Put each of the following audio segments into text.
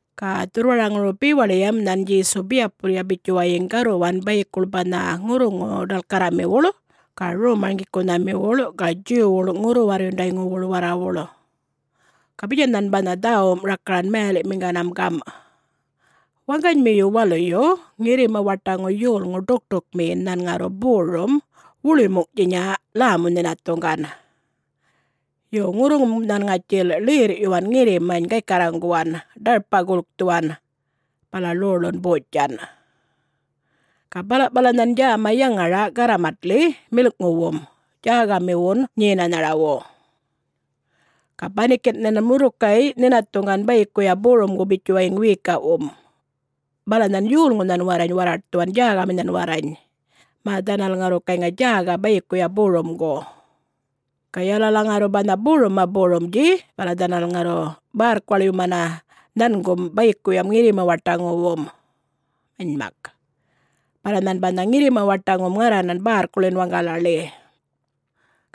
Ga dhurrwaraŋuru bewaḻiyam nhan Djesu biyapulya bitjuwayiŋ garruwan bayikuḻ banha ŋurruŋu-ḏalkarramiwuḻ ga rom-marŋgikunhamiwuḻ ga Djuwwuḻ ŋurru-warrundayŋuwuḻ warrawuḻ. Ga bitjan nhan banha dhäwum rakaran mayaliꞌmiŋganam gamꞌ, “Waŋganymiyu waluyu ŋirrima-waṯaŋu yolŋu ḏukṯukmiyin nhän ŋarru borum, wuḻuymuŋꞌtjinya lämu-nhinathuŋgan. Yo, ŋurruŋum nhan ŋatjil ḻerrꞌyuwan ŋirrimany gaykarraŋguwan, ḏarpa gulkthuwan, bala ḻoḻun botjan. Ga balaꞌpala nhan djäma yaŋaraꞌ garramatḻi milꞌŋuwun djägamiwun nyenanharawu. Ga banikinꞌ nhan murrukay nhinathuŋgan bayikuya borumgun bitjuwaŋ wiyikaꞌwun. Bala nhan yolŋunhan warrany warraṯthuwan djägaminhan warrany, mä dhanal ŋarru gayŋa djäga bayikuya borumgu. Ga yalala ŋarru banha borumma borumdji bala dhanal ŋarru bärrkuwaḻyumana nhangum bayikuyam ŋirrima-waṯaŋuwum. Manymak, bala nhan banha ŋirrima-waṯaŋum ŋarranan bärrkuḻin waŋgalaḻi.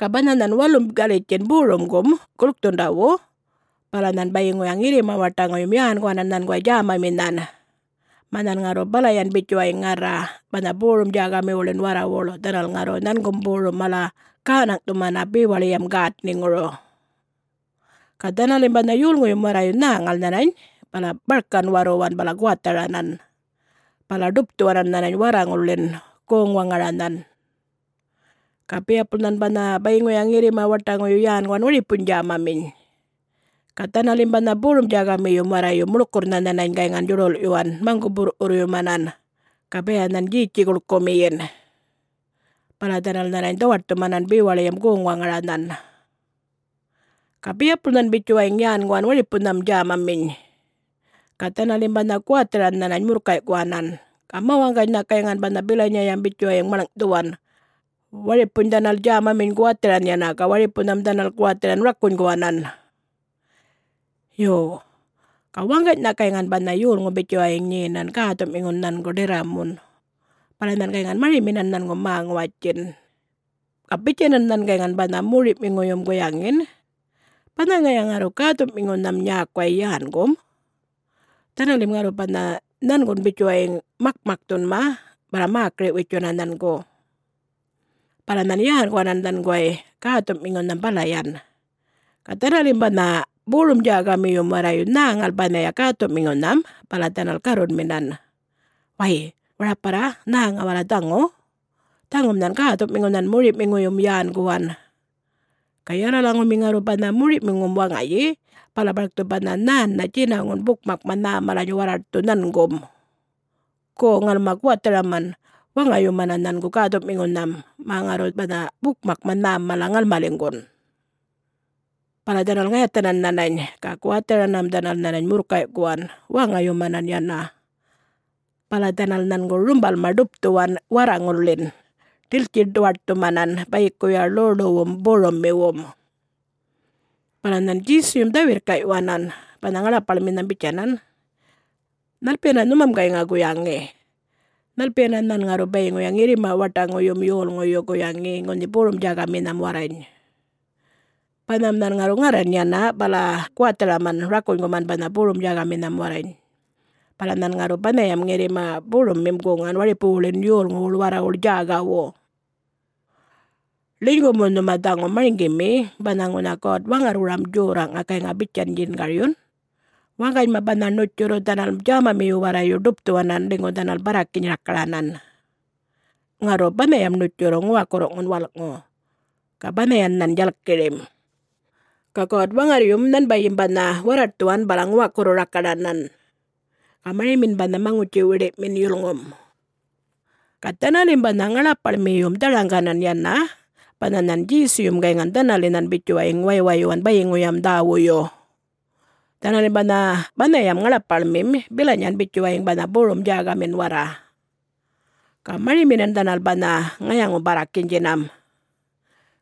Ga banha nhan walum galitjin borumgum gulkthundawu bala nhan bayiŋuya ŋirrima-waṯaŋuyum yänguwanan nhanguway djämaminhan, mä nhan ŋarru balayan bitjuwayiŋ ŋarra banha borum-djägamiwuḻin warrawuḻ dhanal ŋarru nhangum borum mala gänaŋꞌthumana bewaḻiyam gätniŋuru. Ga dhanalim banha yolŋuyum warrayu nhäŋal nhanany bala barkan warruwan bala guwatharanan, bala ḏupthuwanan nhanany warraŋulḻin goŋ-waŋaranhan. Ga biyapul nhan banha bayiŋuya ŋirrima-waṯaŋuyu yänguwan waripuny djämaminy. Ga dhanalim banha borum-djägamiyum warrayu muḻkurrnha nhanany gayŋan djuḏulꞌyuwan maŋguꞌ-burrwurrꞌyumanan ga baya nhan djetji guḻkumiyin. Bala dhanal nhanany dhawaṯthumanan bewaḻiyam goŋ-waŋaranhan. Ga biyapul nhan bitjuwayiŋ yänguwan waripunham djämaminy. Ga dhanalim banha guwatharan nhanany murrkayꞌkuwanan. Ga mä-waŋganynha gayŋan banha bilanyayam bitjuwayiŋ maḻŋꞌthuwan. Waripuny dhanal djämaminy guwatharan yana, ga waripunham dhanal guwatharan rakunyguwanan. Yo, ga waŋganynha gayŋan banha yolŋum bitjuwayŋ nyenan, gäthu'miŋun nhangu, ḏirramun, banha nhan gayŋan mariminan nhangu mä-ŋuwatjin. Ga bitjanan nhan gayŋa banha mori'miŋuyum guyaŋin, ‘Banha ŋaya ŋarru gäthu'miŋunham nyäkuway yängum, dhanalim ŋarru banha nhangun bitjuwayiŋ makmakthunma bala mäkiri-witjuna nhangu.’ Bala nhan yänguwanan nhanguway gäthuꞌmiŋunham balayan. Ga dhanalim banha borum-djägamiyum warrayu nhäŋal banhaya gäthuꞌmiŋunham bala dhanal garrunminan, ‘Way, waraparra nhäŋa warra dhaŋu! Dhaŋum nhan gäthuꞌmiŋunhan moriꞌmiŋuyum yänguwan. Ga yalalaŋumi ŋarru banha moriꞌmiŋum waŋayi bala barkthu banha nhännha djinaŋun bukmakma nhä malany warraṯthu nhangum. Gu, ŋalma guwatharaman waŋayumana nhangu gäthuꞌmiŋunham, mä ŋarru banha bukmakma nhäm mala ŋalmaliŋgun’ Bala dhanal ŋayathanan nhanany, ga guwatharanam dhanal nhanany murrkayꞌkuwanan, waŋayumanan yana. Bala dhanal nhangu rumbalma ḏupthuwan warraŋulḻin, ḏiltji-duwaṯthumanan bayikuya ḻoḻuwum borummiwum.” Bala nhan Djesuyum dhä-wirrꞌkayuwanan banha ŋaḻapaḻminham bitjanan, “Nhalpiyana nhumam gayŋa guyaŋi? Nhalpiyana nhan ŋarru bayiŋuya ŋirrima-waṯaŋuyum yolŋuyu guyaŋi ŋunha borum-djägaminham warrany? Banham nhan ŋarru ŋarran yana bala guwatharaman rakunguman banha borum-djägaminham warrany. Bala nhan ŋarru banhayam ŋirrima borummim guŋan waripuwuḻin yolŋuwuḻ warrawuḻ djägawu. Ḻinygu mu nhuma dhaŋu marŋgimi banha ŋunha God-Waŋarrwuram Djorraꞌŋa gayŋa bitjan djingaryun, ‘Waŋganyma banha ṉutjurru dhanal djämamiyu warrayu ḏupthuwanan ḻinygu dhanal barrakiny rakaranan. Ŋarru banhayam ṉutjurru ŋuwakurruꞌŋun walꞌŋu, ga banhayan nhan djalkirim. Ga God-Waŋarryum nhanbayim banha warraṯthuwan bala ŋuwakurru-rakaranan. Ga marimin banha maŋutji-wiḏiꞌmin yulŋum!’” Ga dhanalim banha ŋaḻapaḻmiyum dharaŋganan yana banha nhan Djesuyum gayŋan dhanalinhan bitjuwayiŋ waywayyuwan bayiŋuyam dhäwuyu. Dhanalim banha banhayam ŋaḻapaḻmim bilanyan bitjuwayiŋ banha borum-djägamin warra. Ga mariminan dhanal banha ŋayaŋu-barrakinydjinam.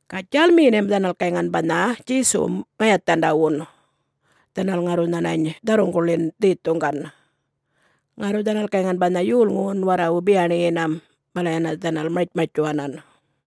Ga djälmiyinam dhanal gayŋan banha Djesuwum ŋayathandawun, dhanal ŋarru nhanany dharruŋguḻin dhethuŋgan. Ŋarru dhanal gayŋan banha yolŋuwun warrawu biyaṉiyinam, bala yana dhanal martjmartjuwanan.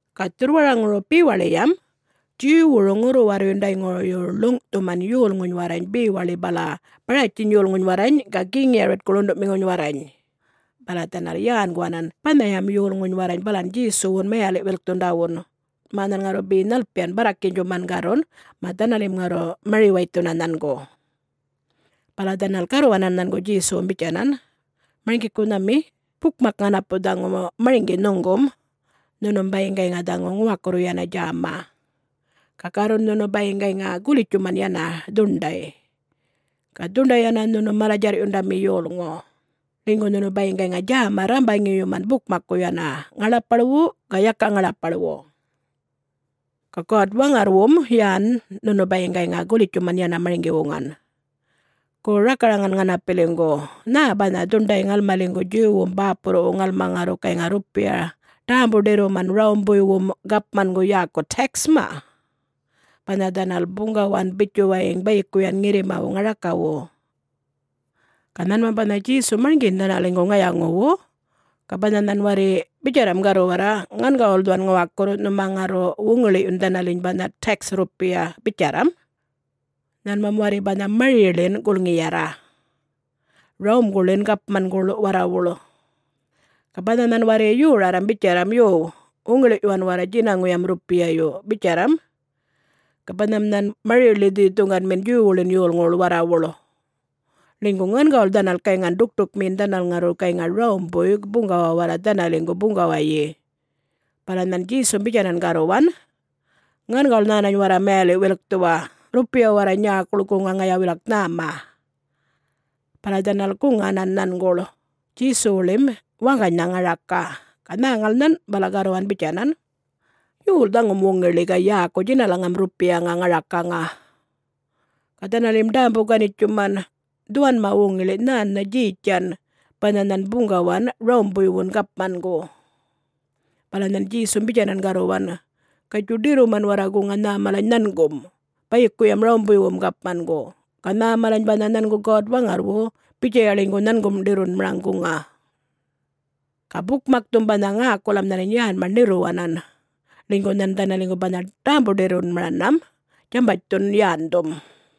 Ga dhurrwaraŋuru bewaḻiyam Djuwwuru ŋurru-warrundayŋuyu ḻuŋꞌthuman yolŋuny warrany bewaḻi bala Baratjiny yolŋuny warrany ga Geŋ Yaritku ḻunduꞌmiŋuny warrany. Bala dhanal yänguwanan banhayam yolŋuny warrany balan Djesuwun mayaliꞌ-wilkthundawun, mä nhan ŋarru be nhalpiyan barrakinydjuman garrun, mä dhanalim ŋarru mari-waythuna nhangu. Bala dhanal garruwanan nhangu Djesuwum bitjanan, “Marŋgikunhami, bukmak ŋanapu dhaŋu marŋgi nhuŋgum, nhunum bayiŋ gayŋa dhaŋu ŋuwakurru yana djäma, ga garrun nhunu bayiŋ gayŋa gulitjtjuman yana dhuṉḏay. Ga dhuṉḏay yana nhunu mala-djarrꞌyundami yolŋu, ḻinygu nhunu bayiŋ gayŋa djäma rrambaŋiyuman bukmakku yana, ŋaḻapaḻwu ga yaka ŋaḻapaḻwu. Ga God-Waŋarrwum yän nhunu bayiŋ gayŋa gulitjtjuman yana marŋgi-wuŋan. Gu rakaraŋan ŋanapiliŋgu, nhä banha dhuṉḏay ŋalmaliŋgu Djuwwum bäpurruwu ŋalma ŋarru gayŋa rrupiya ḏämbu-ḏirruman Rawumbuywum gapmangu yäku tax-ma, banha dhanal buŋgawan bitjuwayiŋ bayikuyan ŋirrimawu ŋarakawu?” Ga nhanmam banha Djesum marŋgiyin dhanaliŋgu ŋayaŋuwu. Ga banha nhan warri bitjarram garruwarra, ‘Ŋangawul dhuwan ŋuwakurru, nhuma ŋarru wuŋiḻiꞌyun dhanaliny banha tax rrupiya,’ bitjarram, nhanmam warri banha mariḻin gulŋiyarra Rawumanguḻin gapmanguḻ warrawuḻ. Ga banha nhan warri yorarram bitjarram, ‘Yuw, wuŋiḻiꞌyuwan warra djinaŋuyam rrupiyayu,’ bitjarram, ga banham nhan mariḻi dhethuŋganmin Djuwwuḻin yolŋuwuḻ warrawuḻ, ḻinygu ŋangawul dhanal gayŋan ḏukṯukmiyin dhanal ŋarru gayŋa Rawumbuy buŋgawa warra dhanaliŋgu buŋgawayi. Bala nhan Djesum bitjanan garruwan, “Ŋangawul nhänany warra mayaliꞌ-wilkthuwa. Rrupiya warra nyäkuḻ guŋa ŋaya wilak nhäma.” Bala dhanal guŋanan nhanguḻ Djesuwuḻim waŋganynha ŋaraka. Ga nhäŋal nhan, bala garruwan bitjanan, “Yol dhaŋum wuŋiḻi ga yäku djinalaŋam rrupiyaŋa ŋarakaŋa?” Ga dhanalim ḏämbu-ganitjuman, “Dhuwanma wuŋiḻi nhännha Djetjan banha nhan buŋgawan Rawumbuywun Gapmangu!” Bala nhan Djesum bitjanan garruwan, “Gatjuy, ḏirruman warra guŋa nhä malany nhangum bayikuyam Rawumbuywum gapmangu. Ga nhä malany banha nhangu God-Waŋarrwu, bitjaya ḻinygu nhangum ḏirrunmaraŋ guŋa.” Ga bukmakthum banha ŋäkulam nhanany yänma ṉirruwanan, ḻinygu nhan dhanaliŋgu banha ḏämbu-ḏirrunmaranam djämbatjthun yändhum.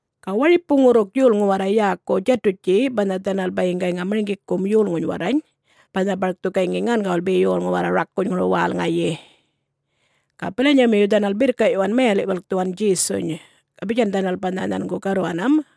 Ga waripu ŋurruk yolŋu warra yäku Djatutji banha dhanal bayiŋ gayŋa marŋgikum yolŋuny warrany, banha barkthu gayŋi ŋangawul be yolŋu warra rakunyŋuru wälŋayi. Ga bilanyamiyu dhanal birrkaꞌyuwan mayaliꞌ-wilkthuwan Djesuny. Ga bitjan dhanal banha nhangu garruwanam,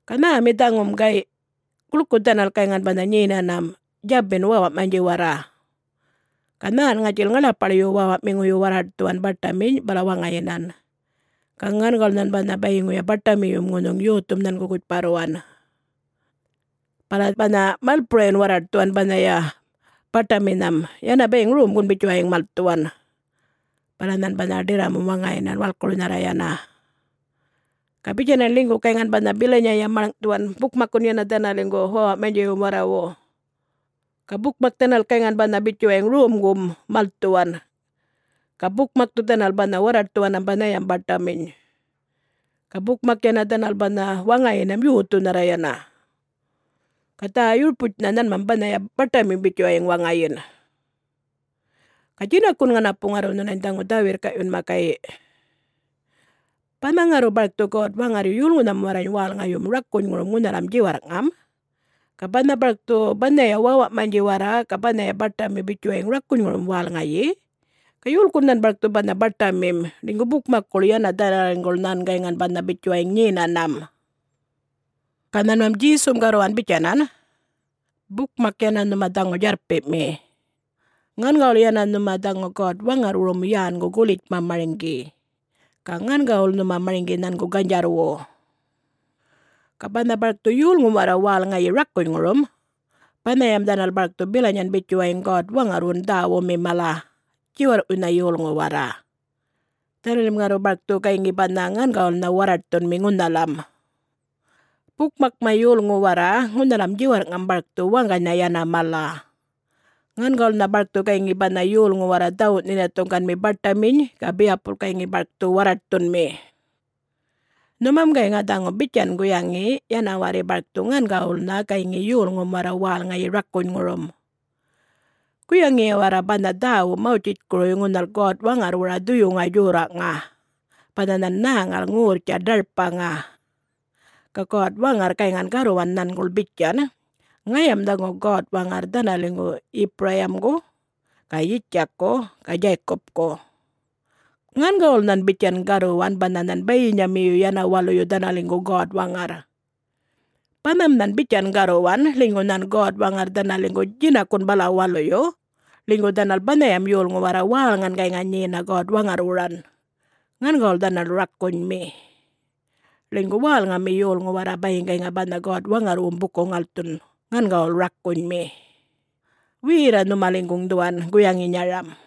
Ga nhämi dhaŋum, gayꞌ? Guḻku dhanal gayŋan banha nyenanam, djabin wäwaꞌmanydji warra. Ga nhän ŋatjil ŋaḻapaḻyu wäwaꞌmiŋuyu warraṯthuwan baṯaminy bala waŋayinan, ga ŋangawul nhan banha bayiŋuya baṯamiyum ŋunhuŋ yothum nhangu gutjparruwan. Bala banha malpurayun warraṯhuwan banhaya baṯaminham yana bayiŋ romgun bitjuwayiŋ malthuwan. Bala nhan banha ḏirramum waŋayinan, walkurnharra yana. Ga bitjanan ḻinygun gayŋan banha bilanyayam maḻŋꞌthuwan bukmakkun yana dhanaliŋgu wäwaꞌmanydjiwum warrawu. Ga bukmak dhanal gayŋan banha bitjuwayiŋ romgum malthuwan, ga bukmakthu dhanal banha warraṯthuwanam banhayanham baṯaminy. Ga bukmak yana dhanal banha waŋayinam yothunharra yana. Ga dhä-yurputjnha nhanmam banhaya baṯamim bitjuwayiŋ waŋayin. Ga djinakun ŋanapu ŋarru nhunany dhaŋu dhä-wirrkaꞌyunma, gayꞌ: Banha ŋarru barkthu God-Waŋarryu yolŋunham warrany wälŋayumu rakunyŋurum ŋunhalam djiwarrꞌŋam, ga banha barkthu banhaya wäwaꞌmanydji warra ga banhaya baṯami bitjuwayiŋ rakunyŋurum wälŋayi, ga yolkun nhan barkthu banha baṯamim, ḻinygu bukmakkuḻ yana dhanaliŋguḻ nhan gayŋan banha bitjuwayiŋ nyenanam?” Ga nhanmam Djesum garruwan bitjanan, “Bukmak yana nhuma dhaŋu djarrpiꞌmi. Ŋangawul yana nhuma dhaŋu God-Waŋarrwurum yängu gulitjma marŋgi, ga ŋangawul nhuma marŋgi nhangu ganydjarrwu. Ga banha barkthu yolŋum warra wälŋayi rakunyŋurum, banhayam dhanal barkthu bilanyan bitjuwayiŋ God-Waŋarrwun dhäwumi mala, djiwarrꞌwuynha yolŋu warra. Dhanalim ŋarru barkthu gayŋi banha ŋangawulnha warraṯthunmi ŋunhalam. Bukmakma yolŋu warra ŋunhalam djiwarrꞌŋam barkthu waŋganynha yana mala. Ŋangawulnha barkthu gayŋi banha yolŋu warra dhawuꞌ nhinathuŋganmi baṯaminy ga biyapul gayŋi barkthu warraṯthunmi. Nhumam gayŋa dhaŋu bitjan guyaŋi yana warri barkthu ŋangawulnha gayŋi yolŋum warra wälŋayi rakunyŋurum. Guyaŋiya warra banha dhäwu Mawtjitjkuruy ŋunhal God-Waŋarrwura dhuyuŋa djorraꞌŋa: banha nhan nhäŋal ŋorrtja ḏarpaŋa, ga God-Waŋarr gayŋan garruwan nhanguḻ bitjan, ‘Ŋayam dhaŋu God-Waŋarr dhanaliŋgu Yipurayimgu ga Yitjakku ga Djaykupku.’ Ŋangawul nhan bitjan garruwan banha nhan bayinyamiyu yana waluyu dhanaliŋgu God-Waŋarr. Banham nhan bitjan garruwan, ḻinygu nhan God-Waŋarr dhanaliŋgu djinakun bala waluyu, ḻinygu dhanal banhayam yolŋu warra wälŋan gayŋa nyena God-Waŋarrwuran, ŋangawul dhanal rakunymi. Ḻinygu wälŋami yolŋu warra bayiŋ gayŋa banha God-Waŋarrwum buku-ŋalthun ŋangawul rakunymi. Werra nhumaliŋguŋ dhuwan guyaŋinyaram.”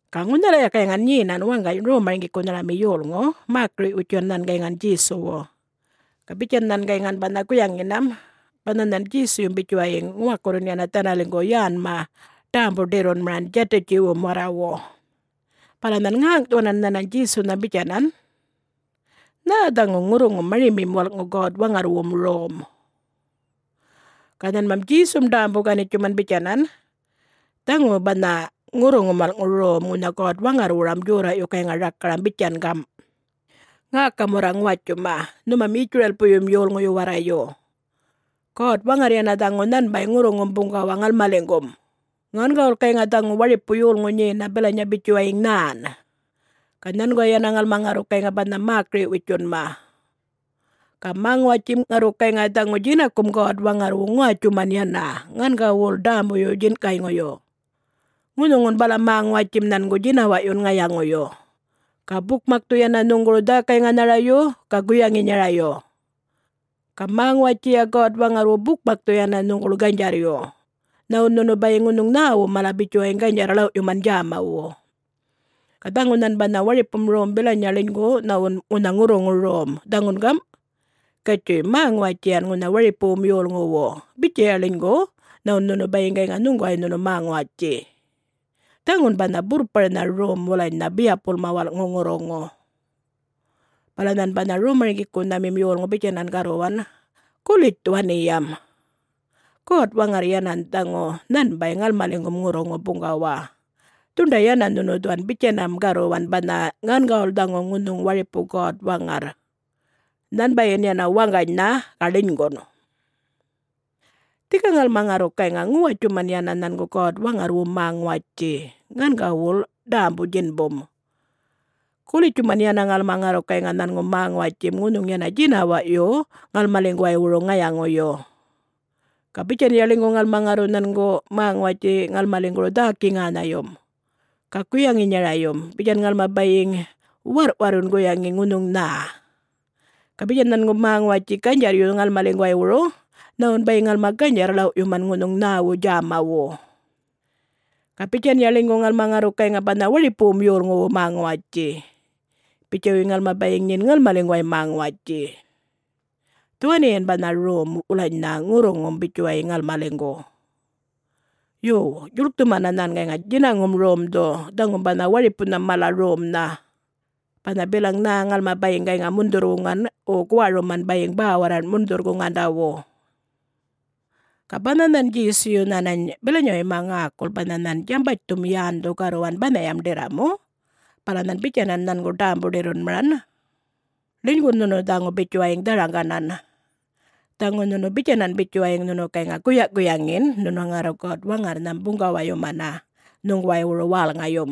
Ga ŋunhalaya gayŋan nyenan waŋgany rom-marŋgikunharami yolŋu, mäkiriꞌ-witjuwan nhan gayŋan Djesuwu. Ga bitjan nhan gayŋan banha guyaŋinam: banha nhan Djesuyum bitjuwayiŋ ŋuwakurrun yana dhanaliŋgu yänma ḏämbu-ḏirrunmaran Djatutiwum warrawu. Bala nhan ŋäŋꞌthuwanan nhanany Djesunham bitjanan, “Nhä dhaŋu ŋurruŋum marimim walꞌŋu God-Waŋarrwum Rom?” Ga nhanmam Djesum ḏämbu-ganitjuman bitjanan, “Dhaŋu banha ŋurruŋum walꞌŋu rom ŋunha God-Waŋarrwurum djorraꞌyu gayŋa rakaram bitjan gamꞌ, ‘Ŋäkam warra ŋuwatjuma, nhumam Yitjuralpuyum yolŋuyu warrayu! God-Waŋarr yana dhaŋu nhanbay ŋurruŋum buŋgawa ŋalmaliŋgum, ŋangawul gayŋa dhaŋu waripu yolŋu nyena bilanya bitjuwayiŋ nhän. Ga nhanguway yana ŋalma ŋarru gayŋa banha mäkiri-witjunma! Ga mä-ŋuwatjim ŋarru gayŋa dhaŋu djinakum God-Waŋarrwu ŋuwatjuman yana, ŋangawul ḏämbuyu-djinꞌkayŋuyu. Ŋunhuŋun bala mä-ŋuwatjim nhangu djinawaꞌyun ŋayaŋuyu, ga bukmakthu yana nhuŋguru dhäkay-ŋanharayu, ga guyaŋinyarayu. Ga mä-ŋuwatjiya God-Waŋarrwu bukmakthu yana nhuŋguḻ ganydjarryu, nhawun nhunu bayiŋ ŋunhuŋ nhäwu mala bitjuwayiŋ ganydjarr-ḻawꞌyuman djämawu.’ Ga dhaŋu nhan banha waripum rom bilanya ḻinygu nhawun ŋunha ŋurruŋu rom, dhaŋun gamꞌ: ‘Gatjuy, mä-ŋuwatjiyan ŋunha waripuwum yolŋuwu bitjaya ḻinygu nhawun nhunu bayiŋ gayŋa nhuŋguway nhunu mä-ŋuwatji.’ Dhaŋun banha burrparnha rom wulanynha biyapulma walꞌŋu ŋurruŋu.” Bala nhan banha rom-marŋgikunhamim yolŋu bitjanan garruwan, “Gulitj dhuwaniyam! God-Waŋarr yana dhaŋu nhanbay ŋalmaliŋgum ŋurruŋu buŋgawa. Dhuṉḏay yana nhunu dhuwan bitjanam garruwan banha ‘Ŋangawul dhaŋu ŋunhuŋ waripu God-Waŋarr,... nhanbayin yana waŋganynha, ga ḻinygun!’ Dhika ŋalma ŋarru gayŋa ŋuwatjuman yana nhangu God-Waŋarrwum mä-ŋuwatji, ŋangawul ḏämbu-djinbum. Gulitjuman yana ŋalma ŋarru gayŋa nhangu mä-ŋuwatjim ŋunhuŋ yana djinawaꞌyu ŋalmaliŋguwaywuru ŋayaŋuyu. Ga bitjanya ḻinygu ŋalma ŋarru nhangu mä-ŋuwatji ŋalmaliŋguru dhäki-ŋänhayum, ga guyaŋinyarayum, bitjan ŋalma bayiŋ warrꞌ-warrun guyaŋi ŋunhuŋ nhä. Ga bitjan nhangu mä-ŋuwatji ganydjarryu ŋalmaliŋguwaywuru nhawun bayiŋ ŋalma ganydjarr-ḻawꞌyuman ŋunhuŋ nhäwu djämawu. Ga bitjanya ḻinygu ŋalma ŋarru gayŋa banha waripuwum yolŋuwu mä-ŋuwatji, bitjuwayiŋ ŋalma bayiŋ nyin ŋalmaliŋguway mä-ŋuwatji. Dhuwaniyan banha rom wulanynha ŋurruŋum bitjuwayiŋ ŋalmaliŋgu. Yo, djuḻkthumana nhan gayŋa djinaŋum romdhu, dhaŋum banha waripunham mala romnha, banha bilaŋ nhä ŋalma bayiŋ gayŋa mundhurr-wuŋan, wo guwaruman bayiŋ bäwarraṉꞌ mundhurr-guŋandawu.” Ga banha nhan Djesuyu nhanany bilanyawuyma ŋäkul banha nhan djambatjthum yändhu garruwan banhayam ḏirramu, bala nhan bitjanan nhangu ḏämbu-ḏirrumanam, “Ḻinygun nhunu dhaŋu bitjuwayiŋ dharaŋganan, dhaŋu nhunu bitjanan bitjuwayiŋ nhunu gayŋa guyaꞌ-guyaŋin nhunu ŋarru God-Waŋarrnham buŋgawayumana nhuŋguwaywuru wälŋayum.”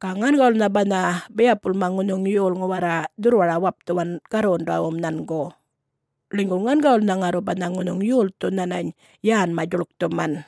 Ga ŋangawulnha banha biyapulma ŋunhuŋ yolŋu warra dhurrwara-wapthuwan garrundawum nhangu, ḻinygu ŋangawulnha ŋarru banha ŋunhuŋ yolthu nhanany yänma djuḻkthuman.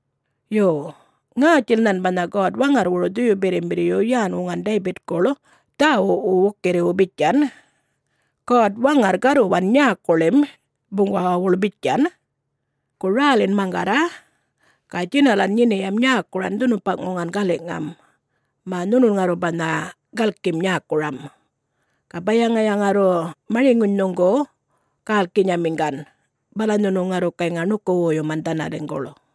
Yo, ŋätjil nhan banha God-Waŋarrwuru Dhuyu-Birrimbirryu yän-wuŋan Daybitkuḻ dhäwuꞌwu wukirriwu bitjan: God-Waŋarr garruwan nyäkuḻim buŋgawawuḻ bitjan, ‘Gu rälin maŋgarra, ga djinalan nyiniyam nyäkuran dhunupaꞌŋuŋan galiꞌŋam, mä nhunun ŋarru banha galkim nyäkuram, ga baya ŋaya ŋarru mariŋuny nhuŋgu gälkinyamiŋgan, bala nhunu ŋarru gayŋa ṉuku-woyuman dhanaliŋguḻ.’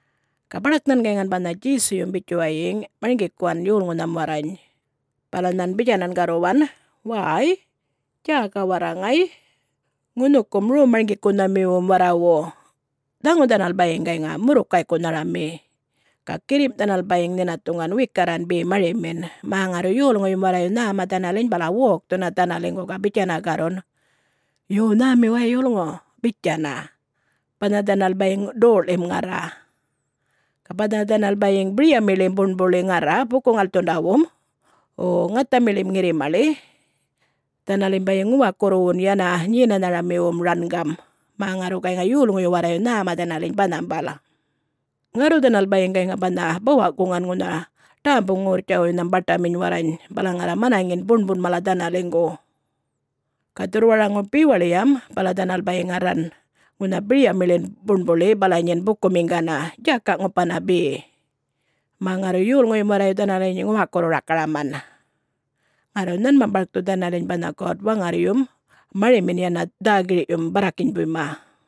Ga baḏak nhan gayŋan banha Djesuyum bitjuwayiŋ marŋgikuwan yolŋunham warrany, bala nhan bitjanan garruwan, “Wäy, djäga warra ŋay, ŋunhukum rom-marŋgikunhamiwum warrawu! Dhaŋu dhanal bayiŋ gayŋa murrukaykunharami, ga girrimꞌ dhanal bayiŋ nhinathuŋgan wikarran be marimin, mä ŋarru yolŋuyum warrayu nhäma dhanaliny bala wokthuna dhanaliŋgu ga bitjana garrun, ‘Yo, nhämi way yolŋu,’ bitjana, banha dhanal bayiŋ doꞌḻim ŋarra. Ga banha dhanal bayiŋ biryamiḻim buṉbuḻi ŋarra buku-ŋalthundawum, wo ŋathamiḻim ŋirrimaḻi, dhanalim bayiŋ ŋuwakurruwun yana nyenanharamiwum rangam, mä ŋarru gayŋa yolŋuyu warrayu nhäma dhanaliny banhambal. Ŋarru dhanal bayiŋ gayŋa banha bawa'-guŋan ŋunha ḏämbu-ŋorrtjawuynham baṯaminy warrany bala ŋarra manaŋin buṉbuṉ mala dhanaliŋgu. Ga dhurrwaraŋuru bewaḻiyam bala dhanal bayiŋ ŋarran ŋunha biryamiḻin buṉbuḻi bala nyin bukumiŋgana, djaka'-ŋupana be, mä ŋarru yolŋuyum warrayu dhanaliny ŋuwakurru-rakaraman. Ŋarru nhanmam barkthu dhanaliny banha God-Waŋarryum marimin yana dhä-gir'yum barrakinybuyma.”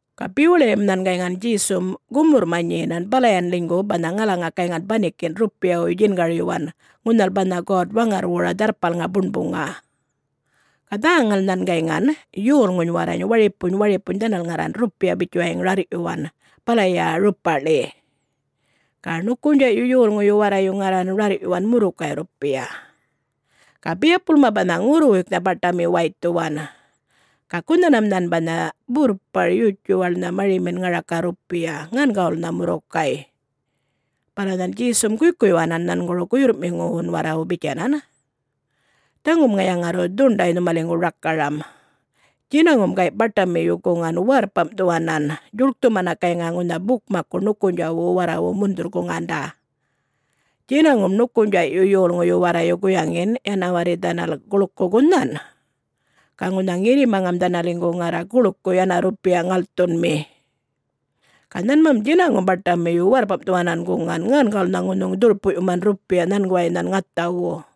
Ga bewaḻiyam nhan gayŋan Djesum gumurrma nyenan balayan ḻinygu banha ŋalaŋa gayŋan banikinꞌ rrupiyawuy djingaryuwan ŋunhal banha God-Waŋarrwura Dharrpalŋa Buṉbuŋa. Ga nhäŋal nhan gayŋan yolŋuny warrany waripuny waripuny dhanal ŋarran rrupiya bitjuwayiŋ rarrꞌyuwan balaya rupaꞌḻi. Ga ṉukunydjaꞌyu yolŋuyu warrayu ŋarran rarrꞌyuwan murrukay rrupiya. Ga biyapulma banha ŋurruwuyknha baṯami waythuwan, ga gunhanam nhan banha burrpar yutjuwaḻnha marimin ŋaraka rrupiya, ŋangawulnha murrukay. Bala nhan Djesum guykuyyuwanan nhanguru guyurrꞌmiŋuwun warrawu bitjanan, “Dhaŋum ŋaya ŋarru dhuṉḏay nhumaliŋgu rakaram: Djinaŋum gayꞌ baṯamiyu guŋan warrpamꞌthuwanan, djuḻkthumana gayŋa ŋunha bukmakku nukunydjaꞌwu warrawu mundhurr-guŋanda. Djinaŋum ṉukunydjaꞌyu yolŋuyu warrayu guyaŋin yana warri dhanal guḻku gunhan. Ga ŋunha ŋirrimaŋam dhanaliŋgu ŋarra guḻku yana rrupiya ŋalthunmi. Ga nhanmam djinaŋum baṯamiyu warrpamꞌthuwanan guŋan, ŋangawulnha ŋunhuŋ dhurpuꞌyuman rrupiya nhanguwayma nhan ŋathawu.”